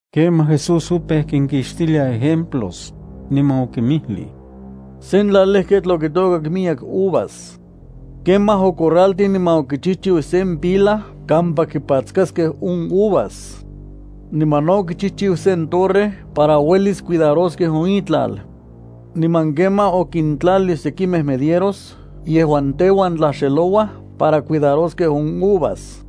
Kemaj Jesús opeu kinkixtilia ejemplos, niman okinmijlij: —Sen tlalejketl okitôkak miyek uvas. Kemaj ocorraltij niman okichijchiu sen pila kampa kipatskaskej on uvas. Niman no okichijchiu sen torre para uelis cuidaroskej on itlal. Niman kemaj okintlalij sekimej medieros yejuan teuan tlaxelouaj para cuidaroskej on uvas.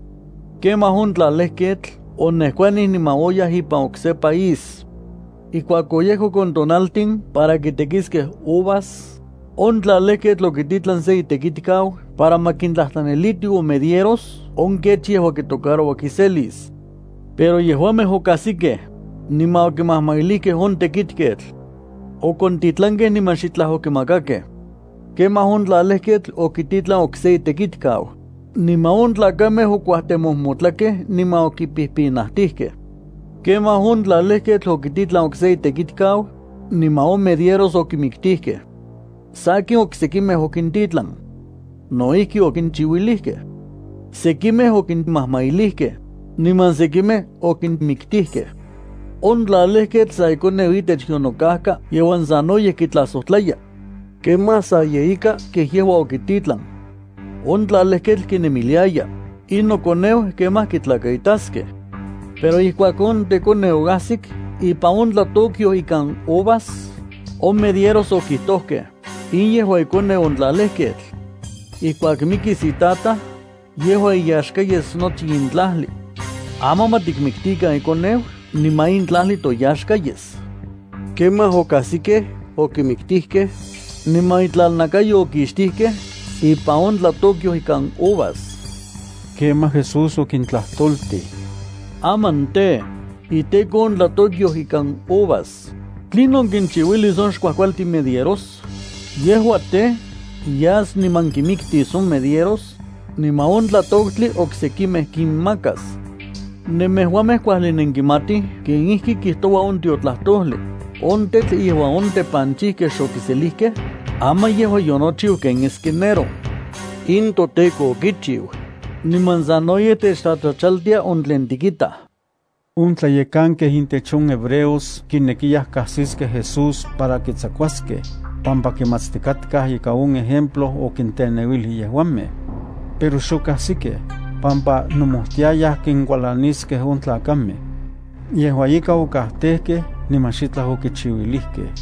Kemaj on tlalejketl onejkuanij niman oyaj ipan okse país. Ijkuak oyejkok on tonaltin para kitekiskej uvas, on tlalejketl okititlan sen itekitkau para ma kintlajtlaniliti on medieros on kech yejua kitocaroua kiselis. Pero yejuamej okajsikej, niman okimajmailijkej on tekitketl. Okontitlankej niman xitlaj okimakakej. Kemaj on tlalejketl okititlan okse itekitkau, niman on tlakamej okuajtemojmotlakej niman okipijpinajtijkej. Kemaj on tlalejketl okititlan okse itekitkau, niman on medieros okimiktijkej. Sakin oksekimej okintitlan. No ijki okinchiuilijkej. Sekimej okinmajmailijkej, niman sekimej okinmiktijkej. ’On tlalejketl sa ikoneu itech yonokajka yejuan sanoyej kitlajsojtlaya. Kemaj sa ye ika kej yejua okititlan. On tlalejketl kinemiliaya: “In nokoneu kemaj kitlakaitaskej.” Pero ijkuak on tekoneu oajsik ipan on tlatokyoj ikan uvas, on medieros okijtojkej: “In yejua ikoneu on tlalejketl. Ijkuak mikis itataj, yejua iyaxka yes nochi in tlajli. Aman ma tikmiktikan ikoneu niman in tlajli toyaxka yes.” Kemaj okajsikej, okimiktijkej, niman itlalnakayo okixtijkej ipan on tlatokyoj ikan uvas. Kemaj Jesús okintlajtoltij: —Aman tej, iteko on tlatokyoj ikan uvas, ¿tlinon kinchiuilis on xkuajkualtin medieros? Yejua tej, yas niman kinmiktis on medieros, niman on tlatoktli oksekimej kinmakas. Nemejuamej kuajli nenkimatij kenijki kijtoua on tiotlajtojli: On tetl yejuan on tepanchijkej xokiselijkej, aman yejua yonochiu ken esquinero. In toTEKO okichiu, niman sanoyej techtlatlachaltia on tlen tikitaj. On tlayekankej intech on hebreos kinekiyaj kajsiskej Jesús para kitsakuaskej, pampa kimatstikatkaj ika on ejemplo okinteneuilij yejuamej. Pero xokajsikej, pampa nomojtiayaj kinkualaniskej on tlakamej. Yejua ika okajtejkej niman xitlaj okichiuilijkej.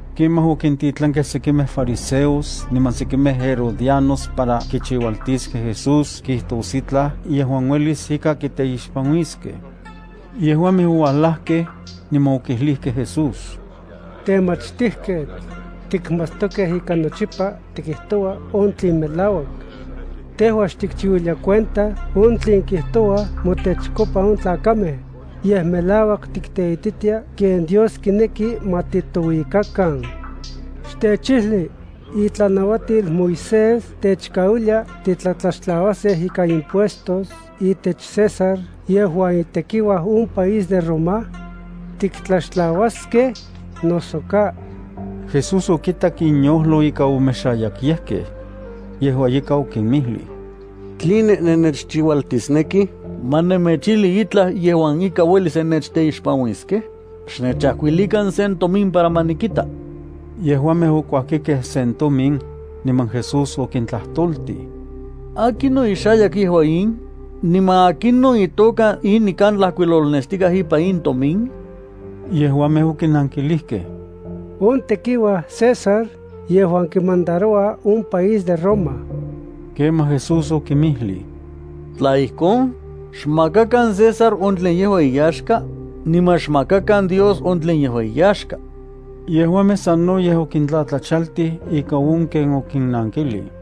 Kemaj okintitlankej sekimej fariseos niman sekimej herodianos para kichiualtiskej Jesús kijtos itlaj yejuan uelis ika kiteixpanuiskej. Yejuamej oualajkej, niman okijlijkej Jesús: —Temachtijketl, tikmatstokej ika nochipa tikijtoua on tlen melauak. Tejua xtikchiuilia cuenta on tlen kijtouaj motechkopa on tlakamej, yej melauak tikteititia ken Dios kineki ma titouikakan. Xtechijli, ¿itlanauatil Moisés techkauilia titlatlaxtlauaskej ikan impuestos itech César yejuan itekiuaj on país de Roma? ¿Tiktlatlaxtlauaskej, noso ka? Jesús okitak inyojlo ika omexayakyejkej. Yejua ika okinmijlij: —¿Tline nennechchiualtisnekij ma nemechijli itlaj yejuan ika uelis nennechteixpanuiskej? Xnechajkuilikan sen tomin para ma nikita. Yejuamej okuajkikej sen tomin, niman Jesús okintlajtoltij: —¿Akinon ixayak yejua in, niman akinon itoka in nikan tlajkuilolnestikaj ipan in tomin? Yejuamej okinankilijkej: —On tekiuaj César yejuan kimandaroua on país de Roma. Kemaj Jesús okinmijlij: —Tla ijkon, xmakakan César on tlen yejua iyaxka, niman xmakakan Dios on tlen yejua iyaxka. Yejuamej sanoyej okintlatlachaltij ika on ken okinnankilij.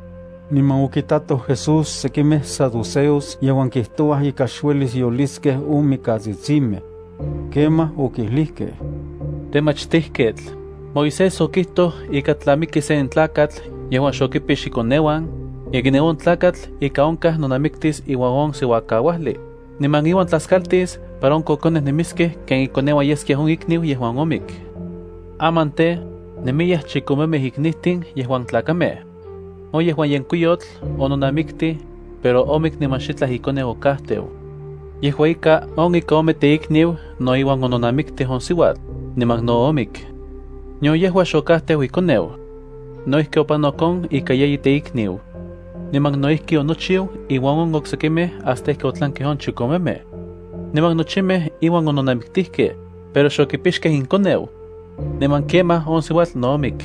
Niman okitatoj Jesús sekimej saduceos yejuan kijtouaj ika xuelis yoliskej on mikatsitsimej. Kemaj okijlijkej: —Temachtijketl, Moisés okijtoj ika tla miki sen tlakatl yejuan xokipix ikoneuan, ikniu on tlakatl ika onkaj nonamiktis iuan on siuakauajli, niman iuan tlaskaltis para on kokonej nemiskej ken ikoneuan yeskia on ikniu yejuan omik. Aman tej, nemiyaj chikomemej iknijtin yejuan tlakamej. On yejuan yenkuiyotl ononamiktij, pero omik niman xitlaj ikoneu okajteu. Yejua ika on ika ome teikniu no iuan ononamiktij on siuatl, niman no omik. Nion yejua xokajteu ikoneu. No ijki opanok on ika yeyi teikniu. Niman no ijki onochiu inuan on oksekimej hasta ijki otlankej on chikomemej. Niman nochimej iuan ononamiktijkej, pero xokipixkej inkoneu. Niman kemaj on siuatl no omik.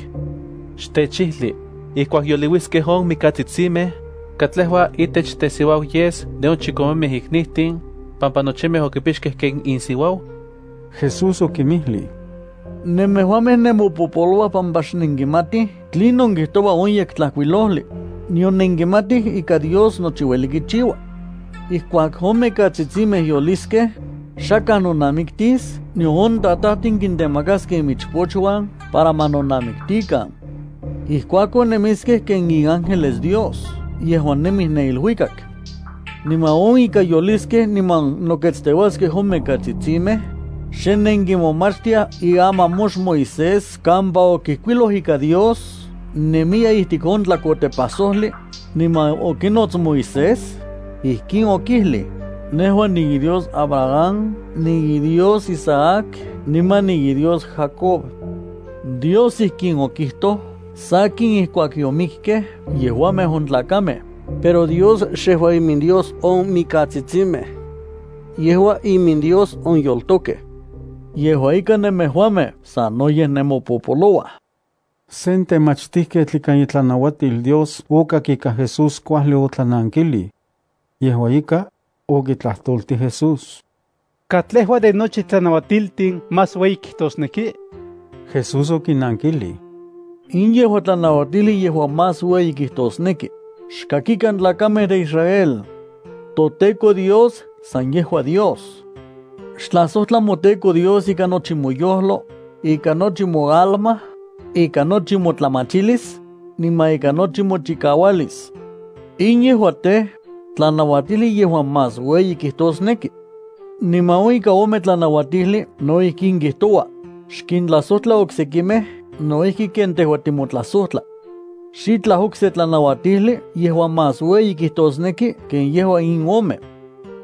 Xtechijli, ijkuak yoliuiskej on mimiktsitsimej, ¿katlejua itech tesiuau yes de on chikomemej iknijtin, pampa nochimej okipixkej ken insiuau? Jesús okinmijlij: —Nemejuamej nenmopopolouaj pampa xnenkimatij tlinon kijtoua on Yektlajkuilojli, nion nenkimatij ika Dios nochi ueli kichiua. Ijkuak on mikatsitsimej yoliskej, xakaj nonamiktis nion on tatajtin kintemakaskej imichpochuan para ma nonamiktikan. Ijkuakon nemiskej ken iángeles Dios yejuan nemij ne iluikak. Niman on ika yoliskej niman noketsteuaskej on mikatsitsimej, ¿xe nenkimomachtiaj iamamox Moisés kampa okijkuiloj ika Dios nemiya ijtik on tlakotepajsojli, niman okinots Moisés? Ijkin okijlij: “Nejua niiDios Abraham, niiDios Isaac, niman niiDios Jacob.” Dios ijkin okijtoj sakin ijkuak yomikkej yejuamej on tlakamej, pero Dios xejua iminDios on mikatsitsimej. Yejua iminDios on yoltokej. Yejua ika nemejuamej sanoyej nenmopopolouaj. Sen temachtijketl ikan itlanuatil Dios okak ika Jesús kuajli otlanankijlij. Yejua ika, okitlajtoltij Jesús: —¿Katlejua de nochi tlanauatiltin más ueyi kijtosneki? Jesús okinankilij: —In yejua tlanauatijli yejuan más ueyi kijtosneki: “Xkakikan tlakamej de Israel. ToTEKO Dios, san yejua Dios. Xtlajsojtla moTEKO Dios ikan nochi moyojlo, ikan nochi moalma, ikan nochi motlamachilis, niman ikan nochi mochikaualis.” In yejua tej, tlanauatijli yejuan más ueyi kijtosneki. Niman on ika ome tlanauatijli no ijkin kijtoua: “Xkintlajsojtla oksekimej no ijki ken tejua timotlajsojtla.” Xitlaj okse tlanauatijli yejuan más ueyi kijtosneki ken yejua in ome.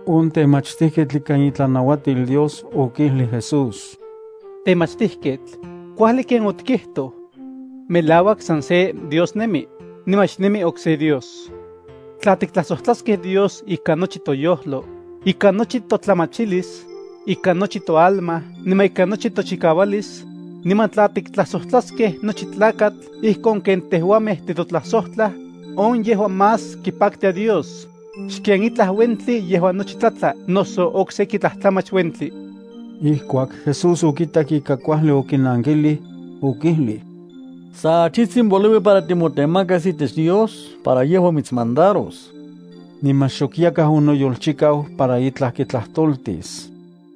On temachtijketl ikan itlanauatil Dios okijlij Jesús: —Temachtijketl, kuajli ken otikijtoj. Melauak, san se Dios nemi, niman xakaj okse Dios. Tla tiktlajsojtlaskej Dios ikan nochi toyojlo, ikan nochi totlamachilis, ikan nochi toalma niman ikan nochi tochikaualis, niman tla tiktlajsojtlaskej nochi tlakatl ijkon ken tejuamej titotlajsojtlaj, on yejua más kipaktia Dios, xken itlaj uentli yejuan nochi tlatla noso okseki tlajtlamach uentli. Ijkuak Jesús okitak ika kuajli okinankilij, okijlij: —Sa achijtsin poliui para timotemakas itech Dios para yejua mitsmandaros. Niman xok yakaj onoyolchikau para itlaj kitlajtoltis.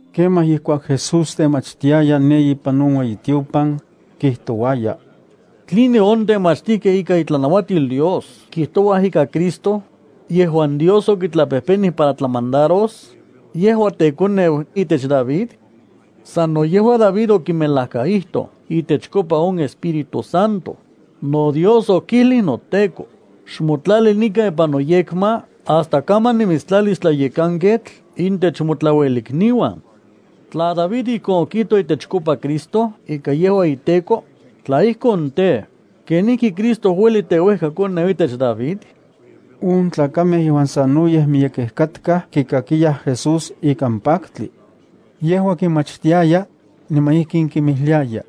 Kemaj ijkuak Jesús temachtiaya ne ipan on ueyitiopan, kijtouaya: —¿Tline on temachtijkej ikan itlanauatil Dios kijtouaj ika Cristo, yejuan Dios okitlapejpenij para tlamandaros, yejua tekoneu itech David? Sano yejua David okimelajkaijtoj itechkopa on Espíritu Santo: NoDios okijlij noTEKO: “Xmotlali nikan ipan noyekma hasta kaman nimitstlalis tlayekanketl intech motlauelikniuan.” Tla David ijkon okijtoj itechkopa Cristo ika yejua iTEKO, tla ijkon tej, ¿kenijki Cristo ueli teuejkakoneu itech David? On tlakamej yejuan sanoyej miyekej katkaj kikakiyaj Jesús ikan paktli. Yejua kinmachtiaya, niman ijkin okinmijliaya: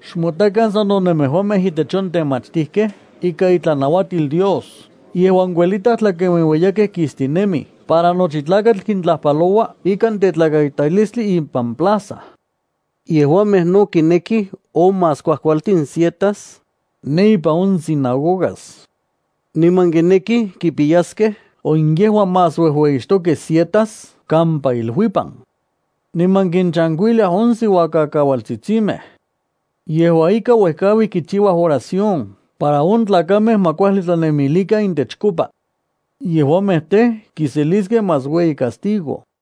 —Xmotakan sano nemejuamej intech on temachtijkej ikan itlanauatil Dios yejuan kuelitaj tlakenueueyakej kistinemij para nochi tlakatl kintlajpalouaj ikan tetlakaitalistli ipan plaza. Yejuamej no kinekij on más kuajkualtin sietas, ne ipan on sinagogas. Niman kinekij kipiyaskej on yejuan más uejueyixtokej sietas kampa iluipan. Niman kinchankuiliaj on siuakaualtsitsimej. Yejua ika uejkaui kichiuaj oración para on tlakamej ma kuajli tlanemilikan intechkopa. Yejuamej tej, kiseliskej más ueyi castigo.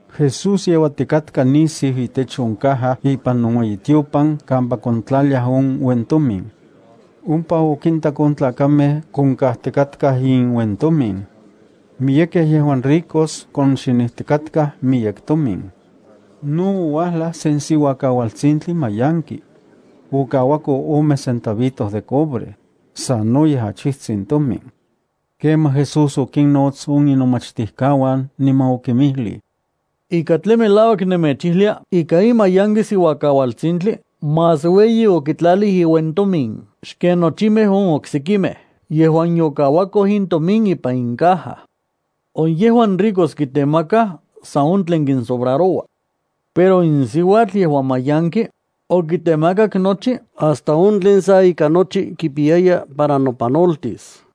Jesús yeuatikatka nisiu itech on caja ipan on ueyitiopan kampa kontlaliaj on uentomin. Ompa okintak on tlakamej konkajtikatkaj inuentomin. Miyekej yejuan ricos konxinijtikatkaj miyek tomin. No ouajlaj sen siuakaualtsintli mayanki. Okauako ome centavito de cobre, sanoyej achijtsin tomin. Kemaj Jesús okinnots on inomachtijkauan, niman okinmijlij: —Ika tlen melauak nemechijlia ika in mayanki siuakaualtsintli más ueyi okitlalij iuentomin xken nochimej on oksekimej yejuan yokauakoj intomin ipan on caja. On yejuan ricos kitemakaj san on tlen kinsobraroua. Pero in siuatl, yejuan mayanki, okitemakak nochi hasta on tlen sa ika nochi kipiyaya para nopanoltis.